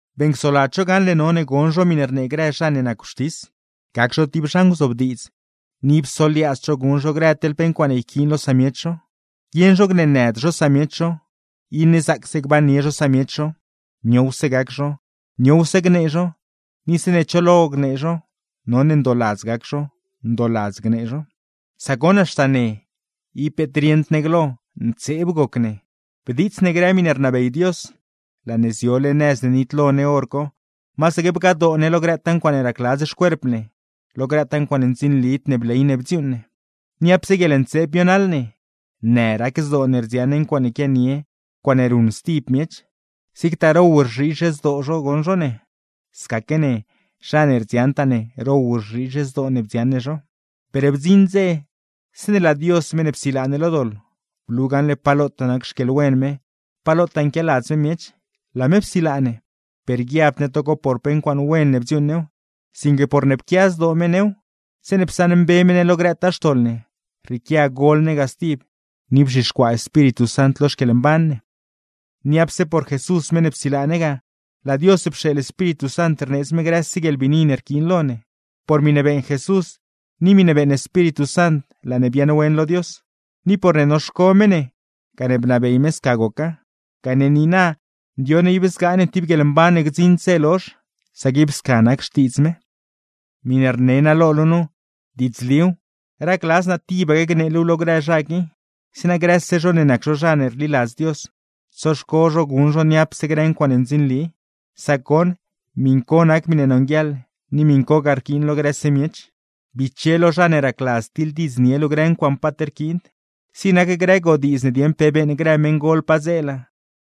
Beeṉcsoladz zho gaṉle none gon zho miṉe rnee grë zha ne nac wxtis, gac zho tib zha nguzobdiidz, ni ib soliaadzd zho guṉ zho grë teḻ pe ncuaaṉe yquiin lo samiech zho. Guieṉ zho gneenëd zho samiech zho, iṉe zaacse gbannie zho samiech zho, niowse gac zho, niowse gnee zho, ni zeeṉe cho lo gnee zho none ndooladz gac zho, ndooladz gnee zho. Sac goṉ haxta ne, ib peet rieṉd ne glo, ntseeb goc ne, bdiits ne grë miṉe rnabey Dios; laa ne ziole nëz ne nitlo ne hor co, masaque bgadoo ne lo grëtaa ncuaaṉe racladz xcuerp ne, lo grëtaa ncuaaṉe ndzinlid ne bley ne bdziuuṉ ne. Niapse guieḻntseeb bionaḻ ne, në rac zdoo ne rdziaṉ ne ncuaaṉe quianie, ncuaaṉe ruṉ stib miech; zigtaa row rzhiizh zdoo zho goṉ zho ne, scaque ne, zha ne rdziaṉtaa ne, row rzhiizh zdoo ne bdziaṉ ne zho. Per bdziṉ dze, zeeṉe laa Dios (meṉ ne psilaa ne lo doḻ) blu gaṉle pa lotaa nac xquieḻwen me, pa lotaa nquialadz me miech, laa me psilaa ne; per guiabd ne togo por pe ncuaaṉe wen ne bdziuuṉ new, sinque porne pquia zdoo me new. Psaṉmbe me ne lo grëtaa xtoḻ ne, rrieequia gol ne ga stib, ni bzhixcuaa Espíritu Sant lo xquieḻmban ne. Niapse por Jesús meṉ ne psilaa ne ga, laa Dios pxeeḻ Espíritu Sant rneedz me grëse guieḻbiini ne rquiin lo ne. Por miṉe beeṉ Jesús ni miṉe beeṉ Espíritu Sant laa ne biaaṉwen lo Dios; ni porne noxco me ne gane bnabey me sca goca. Gane niina, ndioṉ ne ib zgaa ne tib guieḻmban ne gdziṉd dze lozh, sac ib sca nac xtiidz me. Miṉe rne naa lo luu nu, diidzliw. Racladz naa tibaque gnee luuw lo grë zha qui, zeeṉa grëse zho ne nac zho zha ne rliladz Dios, tsoxco zho guṉ zho niapse grë ncuaaṉe ndzinli; sac goṉ, miṉ co nac miṉe nonguieḻ, ni miṉcogaa rquiin lo grëse miech. Biche lo zha ne racladz tiḻdiidznie luu grë ncuaaṉ paat rquiind, zig nac grë godiidz dieṉ pe beeṉ grë meṉgol padzeela,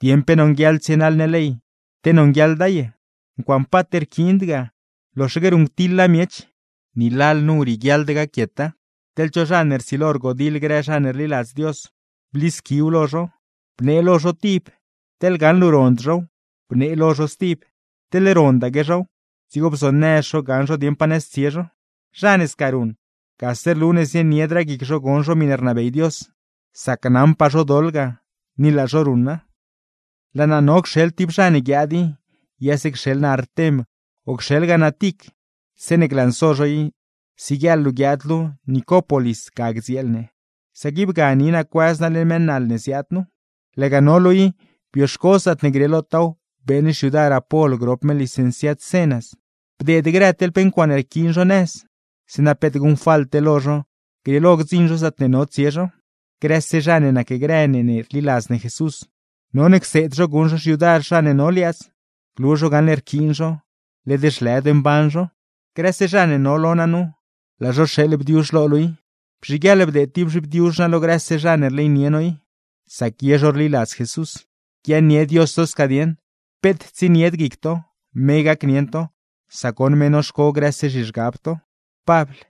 dieṉ pe nonguieḻ tsienaḻ ne ley, te nonguieḻda ye. Ncuaaṉe paat rquiind ga, loxaque ruṉctiḻa miech; ni lalnu rieguiaḻd gaquieta. Teḻ cho zha ne rsilo rgodiḻ grë zha ne rliladz Dios, blisquiw lo zho. Bnee lo zho tib, teḻ gaṉ luu rond zhow, bnee lo zho stib; teḻne rondaque zhow, dzigo bzonëz zho gaṉ zho dieṉ pa nëz tsie zho. Zha ne sca ruṉ, gase rlu ne zieniedraa guic zho gon zho miṉe rnabey Dios; sac naṉpaa zho doḻ ga, ni laa zho ruṉa. Laa naa no cxeḻ tib zha ne guiaad i, yase cxeḻ naa Artem o cxeeḻgaa naa Tic. Zeeṉe glanso zho i, siguieeḻ luu guiaad luu Nicópolis ga gdzieel ne; sac ib ga ni naa cuëz naa leṉ mëë naḻ ne ziaad nu. Laga no luu i, bioxco zaatne grieelotaaw beeṉ xyudar Apol grop me licenciad Zenas. Bdeed grë teḻ pe ncuaaṉe yquiin zho nëz; zeeṉa peet guṉfalte lo zho, grieelo gdziṉ zho zaatne no tsie zho. Grëse zha ne nacgrë ne ne rliladz ne Jesús, none cseed zho guṉ zho xyudar zha ne no liaadz; glu zho gaṉle rquiin zho, led zhlëd mban zho. Grëse zha ne no lo naa nu, laa zho rxeeḻ bdiuzh lo luu i. Bzhiguieḻ bdeed tib zhibdiuzh no lo grëse zha ne rleynie no i; sac ye zho rliladz Jesús. Guiaaṉnie Dios to sca dieṉ. Peet tsienied guic to, me gacnieṉ to; sac goṉ me noxco grëse zhizhgab to. Pabl